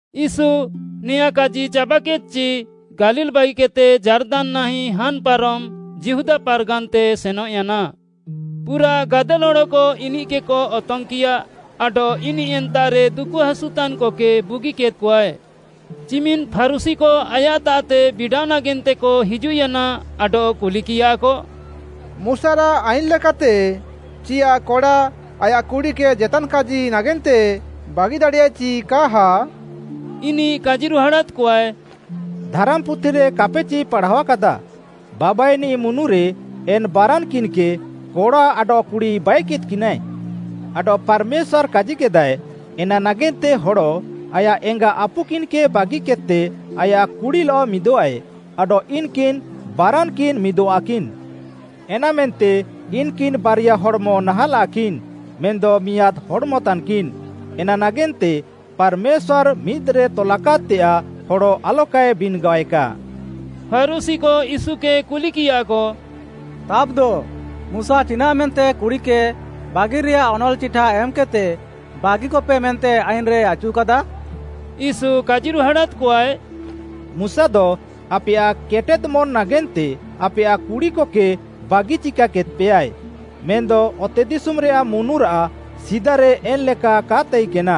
ୟୀଶୁ ନେଆଁଁ କାଜି ଚାବାକେଦ୍‍ଚି ଗାଲିଲ୍‌ ବାଗିକେଦ୍‌ତେ ଯାର୍ଦାନ୍‌ନାହିଁ ହାନ୍‍ପାରମ୍‌ ଯିହୁଦା ପାର୍‌ଗାନ୍‌ତେ ସେନଃୟାନା। ପୁରାଃ ଗାଦେଲ୍‌ ହଡ଼କ ଇନିଃକେକ ଅତଙ୍ଗ୍‌କିୟା ଆଡଃ ଇନିଃ ଏନ୍ତାଃରେ ଦୁକୁହାସୁତାନ୍‌କକେ ବୁଗିକେଦ୍‌କଆଏ। ଚିମିନ୍‌ ଫାରୁଶୀକ ଆୟାଃତାଃତେ ବିଡ଼ାଅ ନାଗେନ୍ତେକ ହିଜୁଃୟାନା ଆଡଃ କୁଲିକିୟାକ, “ମୁଶାରାଃ ଆଇନ୍‌ ଲେକାତେ, ଚିୟାଃ କଡ଼ା ଆୟାଃ କୁଡ଼ିକେ ଜେତାନ୍‌ କାଜି ନାଗେନ୍ତେ ବାଗିଦାଡ଼ିୟାଏ ଚି କାହା?” ଇନିଃ କାଜିରୁହାଡ଼ାଦ୍‌କଆଏ, “ଧାରାମ୍‌ପୁଥିରେ କାପେଚି ପାଢ଼ାଅକାଦା, ବାବାଇନିଃ ମୁନୁରେ ଏନ୍‌ ବାରାନ୍‍କିନ୍‍କେ, କଡ଼ା ଆଡଃ କୁଡ଼ି ବାଇକେଦ୍‍କିନାଏ? ଆଡଃ ପାର୍‌ମେଶ୍ୱାର୍‌ କାଜିକେଦାଏ, ‘ଏନା ନାଗେନ୍ତେ ହଡ଼ ଆୟାଃ ଏଙ୍ଗା ଆପୁକିନ୍‌କେ ବାଗିକେଦ୍‌ତେ ଆୟାଃ କୁଡ଼ିଲଃ ମିଦଃଆଏ, ଆଡଃ ଇନ୍‌କିନ୍‌ ବାରାନ୍‌କିନ୍‌ ମିଦଃଆକିନ୍‌।’ ଏନାମେନ୍ତେ ଇନ୍‌କିନ୍‌ ବାରିଆ ହଡ଼୍‌ମ ନାହାଁଲାଃକିନ୍‌, ମେନ୍‌ଦ ମିଆଁଦ୍‌ ହଡ଼୍‌ମତାନ୍‌କିନ୍‌, ଏନା ନାଗେନ୍ତେ ପାର୍‌ମେଶ୍ୱାର୍‌ ମିଦ୍‌ରେ ତଲାକାଦ୍‌ତେୟାଃ ହଡ଼ ଆଲକାଏ ବିନ୍‌ଗାଏକା।” ଫାରୁଶୀକ ୟୀଶୁକେ କୁଲିକିୟାକ, “ତାବ୍‌ଦ ମୁଶା ଚିନାଃମେନ୍ତେ କୁଡ଼ିକେ ବାଗିରେଆଃ ଅନଲ୍‌ଚିଠା ଏମ୍‌କେଦ୍‌ତେ ବାଗିକପେ ମେନ୍ତେ ଆଇନ୍‌ରେ ଆଚୁକାଦା?” ୟୀଶୁ କାଜିରୁହାଡ଼ାଦ୍‌କଆଏ, “ମୁଶାଦ ଆପେୟାଃ କେଟେଦ୍‌ମନ୍‍ ନାଗେନ୍ତେ ଆପେୟାଃ କୁଡ଼ିକକେ ବାଗି ଚିକାଦ୍‍ପେୟାଏ, ମେନ୍‌ଦ ଅତେଦିଶୁମ୍‌ରେୟାଃ ମୁନୁରାଃ ସିଦାରେ ଏନ୍‍ଲେକା କା ତାଇକେନା।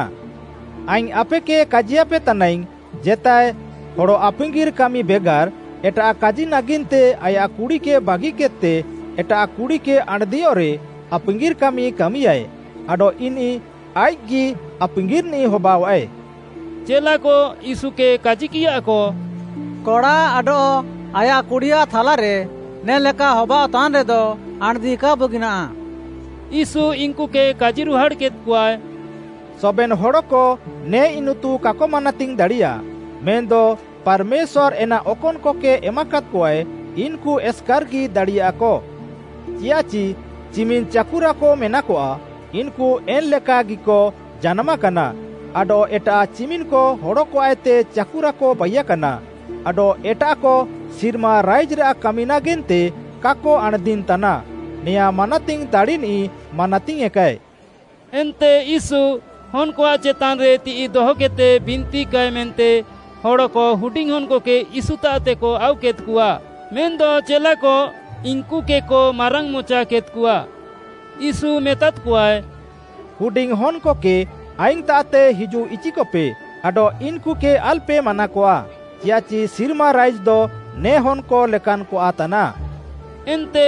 ଆଇଙ୍ଗ୍‌ ଆପେକେ କାଜିୟାପେ ତାନାଇଙ୍ଗ୍‌, ଜେତାଏ ହଡ଼ ଆପାଙ୍ଗିର୍‌ କାମି ବେଗାର୍‌ ଏଟାଃ କାଜି ନାଗେନ୍ତେ ଆୟାଃ କୁଡ଼ିକେ ବାଗିକେଦ୍‌ତେ ଏଟାଃ କୁଡ଼ିକେ ଆଣ୍‌ଦିୟଃରେ ଆପାଙ୍ଗିର୍‌ କାମି କାମିୟାଏ ଆଡଃ ଇନିଃ ଆଇଃକ୍‌ଗି ଆପାଙ୍ଗିର୍‌ନିଃ ହବାଅଃଆଏ।” ଚେଲାକ ୟୀଶୁକେ କାଜିକିୟାକ, “କଡ଼ା ଆଡଃ ଆୟାଃ କୁଡ଼ିଆଃ ଥାଲାରେ ନେ ଲେକା ହବାଅଃତାନ୍‌ରେଦ ଆଣ୍‌ଦି କା ବୁଗିନାଃ।” ୟୀଶୁ ଇନ୍‌କୁକେ କାଜିରୁହାଡ଼୍‌କେଦ୍‌କଆଏ, “ସବେନ୍‌ ହଡ଼କ ନେ ଇନିତୁ କାକ ମାନାତିଙ୍ଗ୍‌ ଦାଡ଼ିୟା, ମେନ୍‌ଦ ପାର୍‌ମେଶ୍ୱାର୍‌ ଏନା ଅକନ୍‌କକେ ଏମାକାଦ୍‌କଆଏ, ଇନ୍‌କୁ ଏସ୍‌କାର୍‌ଗି ଦାଡ଼ିୟାକ। ଚିୟାଃଚି ଚିମିନ୍‌ ଚାକୁରାକ ମେନାକଆ, ଇନ୍‌କୁ ଏନ୍‌ଲେକାଗିକ ଜାନାମାକାନା, ଆଡଃ ଏଟାଃ ଚିମିନ୍‌କ ହଡ଼କଆଃତେ ଚାକୁରାକ ବାଇୟାକାନା, ଆଡଃ ଏଟାଃକ ସିର୍ମା ରାଇଜ୍‌ରାଃ କାମି ନାଗେନ୍ତେ କାକ ଆଣ୍‌ଦିନ୍‌ତାନା। ନେୟାଁ ମାନାତିଙ୍ଗ୍‌ ଦାଡ଼ିନିଃ ମାନାତିଙ୍ଗ୍‌ୟେଁକାଏ।” ଏନ୍ତେ ୟୀଶୁ ହନ୍‌କଆଃ ଚେତାନ୍‌ରେ ତିଃଇ ଦହକେଦ୍‌ତେ ବିନ୍ତିକାଏ ମେନ୍ତେ ହଡ଼କ ହୁଡିଙ୍ଗ୍‌ ହନ୍‌କକେ ୟୀଶୁତାଃତେକ ଆଉକେଦ୍‌କଆ ମେନ୍‌ଦ ଚେଲାକ ଇନ୍‌କୁକେକ ମାରାଙ୍ଗ୍‌ମଚାକେଦ୍‌କଆ। ୟୀଶୁ ମେତାଦ୍‌କଆଏ, “ହୁଡିଙ୍ଗ୍‌ ହନ୍‌କକେ ଆଇଙ୍ଗ୍‌ତାଃତେ ହିଜୁଃଇଚିକପେ ଆଡଃ ଇନ୍‌କୁକେ ଆଲ୍‌ପେ ମାନାକଆ, ଚିୟାଃଚି ସିର୍ମା ରାଇଜ୍‌ଦ ନେ ହନ୍‌କ ଲେକାନ୍‌କଆଃ ତାନାଃ।” ଏନ୍ତେ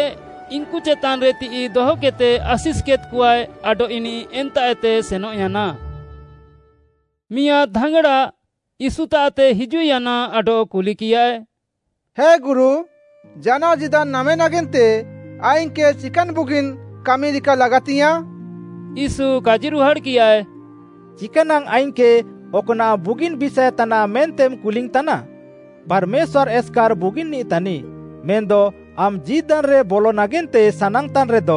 ଇନ୍‌କୁ ଚେତାନ୍‌ରେ ତିଃଇ ଦହକେଦ୍‌ତେ ଆଶିଷ୍‌କେଦ୍‌କଆଏ ଆଡଃ ଇନିଃ ଏନ୍ତାଃଏତେ ସେନଃୟାନା। ମିଆଁଦ୍‌ ଧାଙ୍ଗ୍‌ଡ଼ା ୟୀଶୁତାଃତେ ହିଜୁଃୟାନା ଆଡଃ କୁଲିକିୟାଏ, “ହେ ଗୁରୁ, ଜାନାଅ ଜୀଦାନ୍‌ ନାମେ ନାଗେନ୍ତେ ଆଇଙ୍ଗ୍‌କେ ଚିକାନ୍‌ ବୁଗିନ୍‌ କାମି ରିକା ଲାଗାତିଙ୍ଗ୍‌ୟାଁଃ?” ୟୀଶୁ କାଜିରୁହାଡ଼୍‌କିୟାଏ, “ଚିକାନାଙ୍ଗ୍‌ ଆଇଙ୍ଗ୍‌କେ ଅକ୍‌ନାଃ ବୁଗିନ୍‌ ବିଷାଏ ତାନାଃ ମେନ୍ତେମ୍‌ କୁଲିଙ୍ଗ୍‌ତାନା? ପାର୍‌ମେଶ୍ୱାର୍‌ ଏସ୍‌କାର୍‌ ବୁଗିନ୍‌ନିଃ ତାନିଃ। ମେନ୍‌ଦ ଆମ୍‌ ଜୀଦାନ୍‌ରେ ବଲ ନାଗେନ୍ତେ ସାନାଙ୍ଗ୍‌ତାନ୍‌ରେଦ,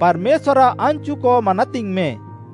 ପାର୍‌ମେଶ୍ୱାର୍‌ଆଃ ଆନ୍‌ଚୁକ ମାନାତିଙ୍ଗ୍‌ମେ।”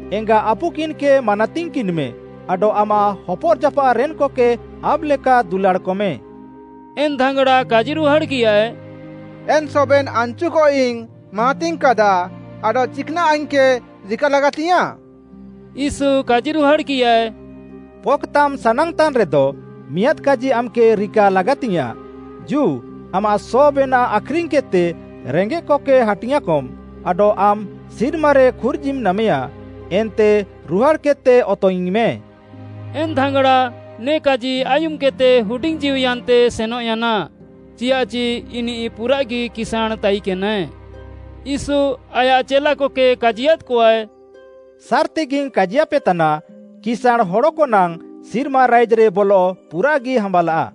ଏଙ୍ଗା ଆପୁକିନ୍‌କେ ମାନାତିଙ୍ଗ୍‌କିନ୍‌ମେ, ଆଡଃ ଆମାଃ ହପର୍‌ଜାପାଃରେନ୍‌କକେ ଆମ୍‌ଲେକା ଦୁଲାଡ଼୍‌କମେ।” ଏନ୍‌ ଧାଙ୍ଗ୍‌ଡ଼ା କାଜିରୁହାଡ଼୍‌କିୟାଏ, “ଏନ୍‌ ସବେନ୍‌ ଆନ୍‌ଚୁକଇଙ୍ଗ୍‌ ମାନାତିଙ୍ଗ୍‌କାଦା ଆଡଃ ଚିକ୍‌ନାଃ ଆଇଙ୍ଗ୍‌କେ ରିକା ଲାଗାତିଙ୍ଗ୍‌ୟାଁଃ?” ୟୀଶୁ କାଜିରୁହାଡ଼୍‌କିୟାଏ, “ପକ୍‌ତାମ୍‌ ସାନାଙ୍ଗ୍‌ତାନ୍‌ରେଦ, ମିଆଁଦ୍‌ କାଜି ଆମ୍‌କେ ରିକା ଲାଗାତିଙ୍ଗ୍‌ୟାଁଃ, ଜୁ, ଆମାଃ ସବେନାଃ ଆଖ୍‌ରିଙ୍ଗ୍‌କେଦ୍‌ତେ ରେଙ୍ଗେଃକକେ ହାଟିଙ୍ଗ୍‌ଆଁକମ୍‌, ଆଡଃ ଆମ୍‌ ସିର୍ମାରେ ଖୁର୍ଜିମ୍‌ ନାମେୟା। ଏନ୍ତେ ରୁହାଡ଼୍‌କେଦ୍‌ତେ ଅତଙ୍ଗ୍‌ଇଙ୍ଗ୍‌ମେ।” ଏନ୍‌ ଧାଙ୍ଗ୍‌ଡ଼ା ନେ'କାଜି ଆୟୁମ୍‌କେଦ୍‌ତେ ହୁଡିଙ୍ଗ୍‌ଜୀଉୟାନ୍ତେ ସେନଃୟାନା ଚିୟାଃଚି ଇନିଃ ପୁରାଃଗି କିସାଁଣ୍‌ ତାଇକେନାଏ। ୟୀଶୁ ଆୟାଃ ଚେଲାକକେ କାଜିୟାଦ୍‍କଆଏ, “ସାର୍‌ତିଗିଙ୍ଗ୍‌ କାଜିୟାପେତାନା, କିସାଁଣ୍‌ ହଡ଼କନାଙ୍ଗ୍‌ ସିର୍ମା ରାଇଜ୍‌ରେ ବଲଃ ପୁରାଃଗି ହାମ୍ବାଲାଃ।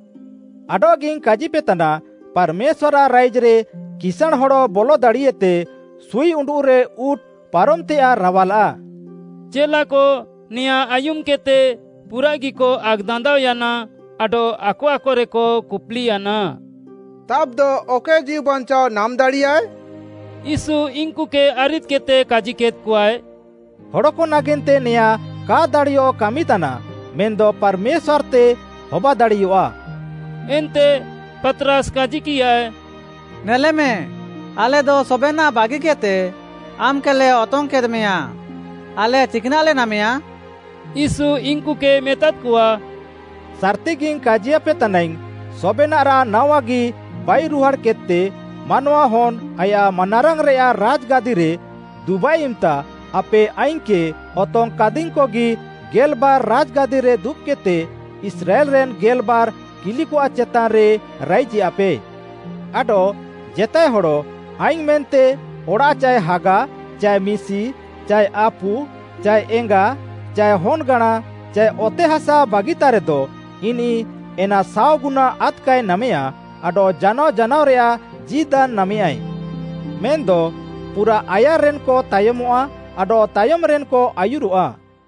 ଆଡଃଗିଇଙ୍ଗ୍‌ କାଜିପେତାନା, ପାର୍‌ମେଶ୍ୱାର୍‌ଆଃ ରାଇଜ୍‌ରେ କିସାଁଣ୍‌ ହଡ଼ ବଲ ଦାଡ଼ିଏତେ, ସୁଇ ଉଣ୍ଡୁଃରେ ଉଁଟ୍‌ ପାରମଃତେୟାଃ ରାୱାଲାଃ।” ଚେଲାକ ନେଆଁଁ ଆୟୁମ୍‌କେଦ୍‌ତେ ପୁରାଃଗିକ ଆକ୍‌ଦାନ୍ଦାଅୟାନା, ଆଡଃ ଆକ ଆକରେକ କୁପ୍‌ଲିୟାନା, “ତାବ୍‌ଦ ଅକଏ ଜୀଉ ବାଞ୍ଚାଅ ନାମ୍‌ ଦାଡ଼ିୟାଏ?” ୟୀଶୁ ଇନ୍‌କୁକେ ଆରିଦ୍‌କେଦ୍‌ତେ କାଜିକେଦ୍‌କଆଏ, “ହଡ଼କ ନାଗେନ୍ତେ ନେଆଁଁ କା ଦାଡ଼ିୟଃ କାମିତାନା ମେନ୍‌ଦ ପାର୍‌ମେଶ୍ୱାର୍‌ତେ ହବାଦାଡ଼ିୟଆଃ।” ଏନ୍ତେ ପାତ୍‌ରାସ୍‌ କାଜିକିୟାଏ, “ନେଲେମେ, ଆଲେଦ ସବେନାଃ ବାଗିକେଦ୍‌ତେ ଆମ୍‌କେଲେ ଅତଙ୍ଗ୍‌କେଦ୍‌ମେୟାଁ। ଆଲେ ଚିକ୍‌ନାଃଲେ ନାମେୟା?” ୟୀଶୁ ଇନ୍‌କୁକେ ମେତାଦ୍‌କଆ, “ସାର୍‌ତିଗିଙ୍ଗ୍‌ କାଜିୟାପେ ତାନାଇଙ୍ଗ୍‌, ସବେନାଃରାଃ ନାୱାଗି ବାଇରୁହାଡ଼୍‌କେଦ୍‌ତେ, ମାନୱାହନ୍‌ ଆୟାଃ ମାନାରାଙ୍ଗ୍‌ରେୟାଃ ରାଜ୍‌ଗାଦିରେ ଦୁବାଃଏ ଇମ୍‌ତା ଆପେ ଆଇଙ୍ଗ୍‌କେ ଅତଙ୍ଗ୍‌କାଦିଙ୍ଗ୍‌କଗି ଗେଲ୍‌ବାର୍‌ ରାଜ୍‌ଗାଦିରେ ଦୁବ୍‌କେଦ୍‌ତେ ଇସ୍ରାଏଲ୍‌ରେନ୍ ଗେଲ୍‌ବାର୍ କିଲିକଆଃ ଚେତାନ୍‌ରେ ରାଇଜେୟାପେ। ଆଡଃ ଜେତାଏ ହଡ଼ ଆଇଙ୍ଗ୍‌ ମେନ୍ତେ ଅଡ଼ାଃ ଚାଏ ହାଗା ଚାଏ ମିଶି ଚାଏ ଆପୁ ଚାଏ ଏଙ୍ଗା ଚାଏ ହନ୍‌ଗାଁଣା ଚାଏ ଅତେହାସା ବାଗିତାରେଦ, ଇନିଃ ଏନା ସାଅଗୁନା ଆଦ୍‌କାଏ ନାମେୟା ଆଡଃ ଜାନାଅ ଜାନାଅରେୟାଃ ଜୀଦାନ୍‌ ନାମେୟାଏ। ମେନ୍‌ଦ ପୁରାଃ ଆୟାର୍‌ରେନ୍‌କ ତାୟମଃଆ ଆଡଃ ତାୟମ୍‌ରେନ୍‌କ ଆୟୁରଃଆ।